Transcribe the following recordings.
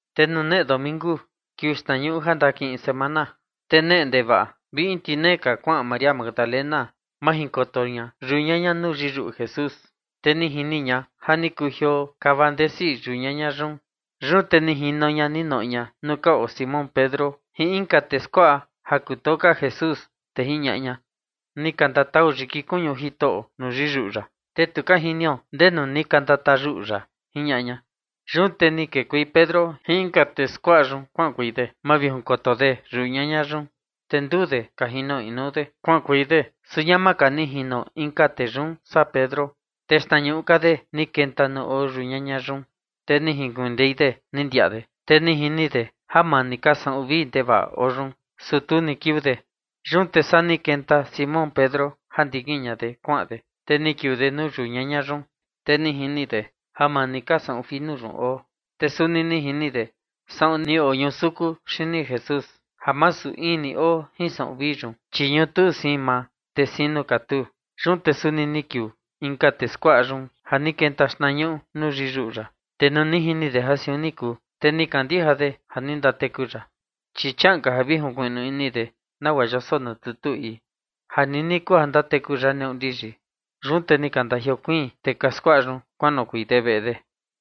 Te nuu neꞌe domingu, kiuu xtnañuꞌu ja ndakiꞌin semana, te neꞌe ndevaꞌa vi in tinee ka, kuaꞌan María Magdalena majinkoto ña yau ñaña nuu yiyuꞌu Jesús. Te ni jini ña ja ni kujioo kava ndesi yuꞌu yau ñaña yun. Yun te ni jino ña ni noꞌo ña nuu ka oo Simón Pedro jin inka tee skuaꞌa ja kutoo ka Jesús, te jiñaꞌa ña: ―Ni ka ndatau yiki kuñu Jitoꞌo nuu yiyuꞌu ya, te tu ka jinio ndenu ni ka ndatayuꞌu ya ―jiñaꞌa ña. Yun te ni kekuei Pedro jin inka tee skuaꞌa yun kuaꞌankuei de mavijinkoto de yau ñaña yun. Te nduu de ka jino inuu de kuaꞌankuei de, su ñama ka ni jino inka tee yun saa Pedro, te xtnañuꞌu ka de ni kenta nuu oo yau ñaña yun. Te jinkuindei de ni ndiaꞌa de, te ni jini de ja maa ni ka saꞌun vii ndevaꞌa oo yun, su tu ni kiuu de. Yun te saa ni kenta Simón Pedro ja ndikin ña de kuaꞌan de, te ni kiuu de nuu yau ñaña yun, te ni jini de ja maa ni ka saꞌun finu yun oo. Te suni ni jini de saꞌun ni oñusuku xini Jesús, ja masu in ni oo jin saꞌun vii yun, chi ñutuu siin maa, te siin nuu katuu. Yun te suni ni kiuu inka tee skuaꞌa yun ja ni kenta xtnañuꞌu nuu yiyuꞌu ya, te nuu ni jini de ja siun ni kuu, te ni kandija de ja ni ndateku ya. Chi chiaꞌan ka ja vi junkuiꞌnu ini de nagua yoso nuu tutu ii, ja nini kuu ja ndateku ya neꞌu ndiyi. Yun te ni ka ndajiokuiin tee ka skuaꞌa yun kuanoꞌokuei de veꞌe de.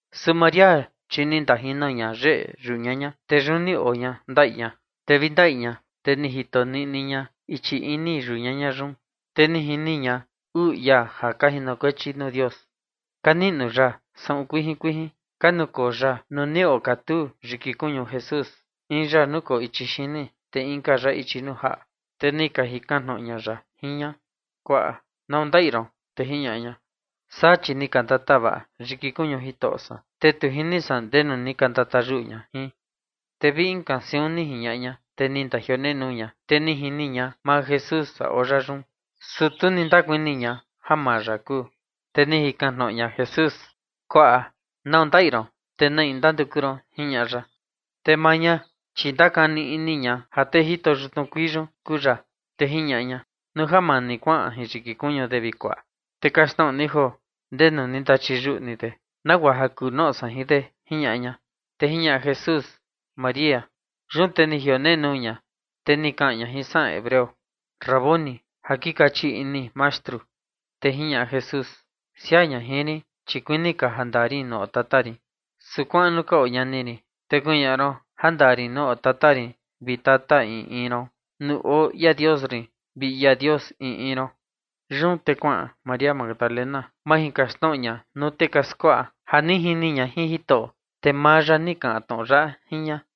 Su María, chi ni ndajino ña yeꞌe yau ñaña, te yun ni oo ña ndaꞌi ña, te vi ndaꞌi ña, te ni jito niꞌni ña ichi ini yau ñaña yun. Te ni jini ña uu ia ka jinokuechi nuu Dios, ka niꞌnu ya saꞌun kuijin kuijin, ka nukoo ya nuu ni okatuu yiki kuñu Jesús, in ya nukoo ichi xini, te inka ya ichi nuu jaꞌa. Te ni ka jikan tnoꞌo ña ya jin ña: ―Kuaꞌa, ¿nau ja ndaꞌi ron? Te jiñaꞌa ña: ―Saa, chi ni ka ndatava yiki kuñu jitoꞌo san, te tu jini san ndenu ni ka ndatayuꞌu ña jin. Te vi inka siun jiñaꞌa ña, te ni ndajionenuu ña, te ni jini ña maa Jesús ja oo ya yun, su tu ni ndakuni ña ja maa ya kuu. Te ni jikan tnoꞌo ña Jesús: ―Kuaꞌa, ¿nau ja ndaꞌi ron? ¿Te na in ndanduku ron? ―jiñaꞌa ya. Te maa ña, chi ni ndakani ini ña ja tee jito xtnuu kuii yun kuu ya, te jiñaꞌa ña: ―Nuu ja maa ni kuaꞌan jin yiki kuñu de, vi kuaꞌa, te kaxtnoꞌo ni joo ndenu ni ndachiyuꞌu ni de, nagua ja kuu noꞌo san jin de ―jiñaꞌa ña. Te jiñaꞌa Jesús: ―María. Yun te ni jionenuu ña, te ni kaꞌan ña jin saꞌan hebreo: ―Raboni, ―ja kei kaꞌan “Mastru”. Te jiñaꞌa Jesús: ―Siaa ña jin rin, chi kuini ka ja ndaa rin nuu oo Tata rin, su kuaꞌan nuu ka oo ñani rin, te kuñaꞌa ron ja ndaa rin nuu oo Tata rin vi Tata in in ron, nuu oo ia Dios rin vi ia Dios in in ron. Yun te kuaꞌan María Magdalena majinkaxtnoꞌo ña nuu tee ka skuaꞌa ja ni jini ña Jitoꞌo, te maa ya ni kaꞌan tnoꞌo yaꞌa jin ña.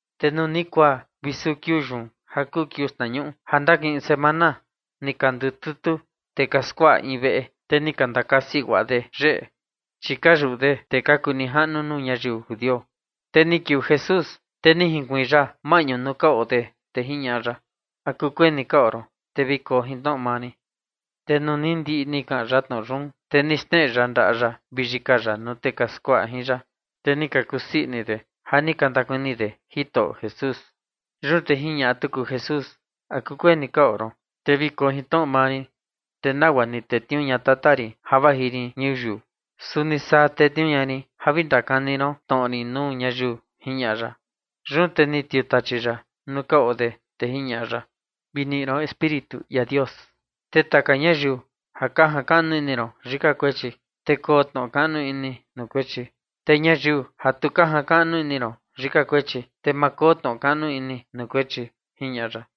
Te nuu ni kuaa vi suu kiuu yun ja kuu kiuu xtnañuꞌu ja ndakiꞌin semana, ni ka ndututu tee ka skuaꞌa in veꞌe, te ni ka ndakasi guaꞌa de yeꞌe, chi ka yuꞌu de tee ka kuu nijaꞌnu nuu ñayiu judio. Te ni kiuu Jesús, te ni junkuiin ya maꞌñu nuu ka oo de, te jiñaꞌa ya: ―¿A kukuee ni ka oo ron? Te vi koo jin tnoꞌo mani. Te nuu ni ndiꞌi ni kaꞌan ya tnoꞌo yun, te ni xneꞌe ya ndaꞌa ya vi yika ya nuu tee ka skuaꞌa jin ya. Te ni ka kusii ini de ja ni ka ndakuni de Jitoꞌo Jesús. Yun te jiñaꞌa tuku Jesús: ―¿A kukuee ni ka oo ron? Te vi koo jin tnoꞌo mani. Te nagua ni tetniuu ña Tata rin ja vaji rin ñuyiu, suni saa tetniuu ña rin ja vi ndakani ron tnoꞌo rin nuu ñayiu ―jiñaꞌa ya. Yun te ni tiutachi ya nuu ka oo de, te jiñaꞌa ya: ―Vi niꞌi ron Espíritu ia Dios. Te taka ñayiu ja ka jakaꞌnu ini ron yika kuechi, te koo tnoꞌo kaꞌnu ini nuu kuechi. Te ñayiu ja tu ka jakaꞌnu ini ron yika kuechi, te ma koo tnoꞌo kaꞌnu ini nuu kuechi ―jiñaꞌa ya.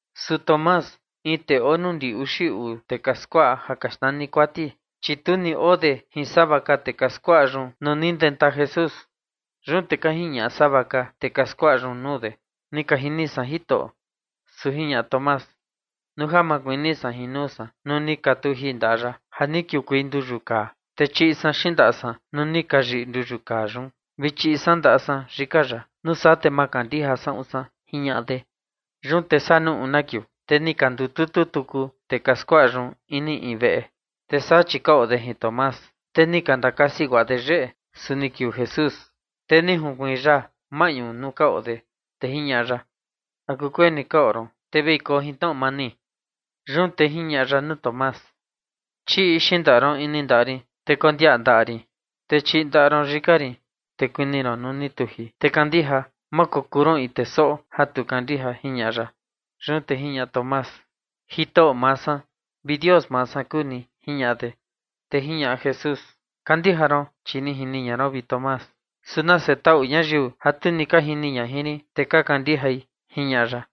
Su Tomás, in tee oo nuu ndi uxi uu tee ka skuaꞌa ja ka xnani Kuati, chi tu ni oo de jin sava ka tee ka skuaꞌa yun na ni ndenta Jesús. Yun te ka jiñaꞌa sava ka tee ka skuaꞌa yun nuu de: ―Ni ka jini san Jitoꞌo. Su jiñaꞌa Tomás: ―Nuu ja ma kuni san jin nuu san nuu ni ka tuji ndaꞌa ya ja ni kiukuei nduyu kaa, te chiꞌi san xindaꞌa san nuu ni ka yiꞌi nduyu kaa yun, vi chiꞌi san ndaꞌa san yika ya, nuu saa te ma kandija saꞌun san ―jiñaꞌa de. Yun te saa nuu una kiuu, te ni ka ndututu tuku tee ka skuaꞌa yun ini in veꞌe, te saa chi ka oo de jin Tomás. Te ni ka ndakasi guaꞌa de yeꞌe, su ni kiuu Jesús, te ni junkuiin ya maꞌñu nuu ka oo de, te jiñaꞌa ya: ―¿A kukuee ni ka oo ron? Te vi koo jin tnoꞌo mani. Yun te jiñaꞌa ya nuu Tomás: ―Chiꞌi xindaꞌa ron ini ndaꞌa rin, te kondiaꞌa ndaꞌa rin, te chiꞌi ndaꞌa ron yika rin, te kuni ron nuu ni tuji, te kandija; ma kokuu ron in tee soꞌo ja tu kandija ―jiñaꞌa ya. Yun te jiñaꞌa Tomás: ―Jitoꞌo maa san vi Dios maa san kuu ni ―jiñaꞌa de. Te jiñaꞌa Jesús: ―Kandija ron chi ni jini ña ron, vi Tomás, su nase taꞌu ñayiu ja tu ni ka jini ñai jin rin, te ka kandijai ―jiñaꞌa ya.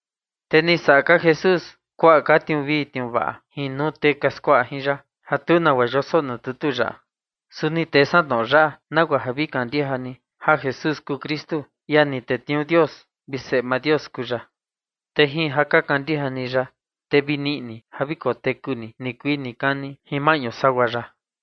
Te ni saꞌa ka Jesús kuaꞌa ka tniuu vii tniuu vaꞌa jin nuu tee ka skuaꞌa jin ya, ja tu nagua yoso nuu tutu yaꞌa. Su ni tee san tnoꞌo yaꞌa nagua ja vi kandija ni ja Jesús kuu Kristu, ia ni tetniuu Dios, vi Seꞌe maa Dios kuu ya. Te jin ja ka kandija ni ya, te vi niꞌi ni ja vi koteku ni nikuii nikani jin maꞌñu sagua ya.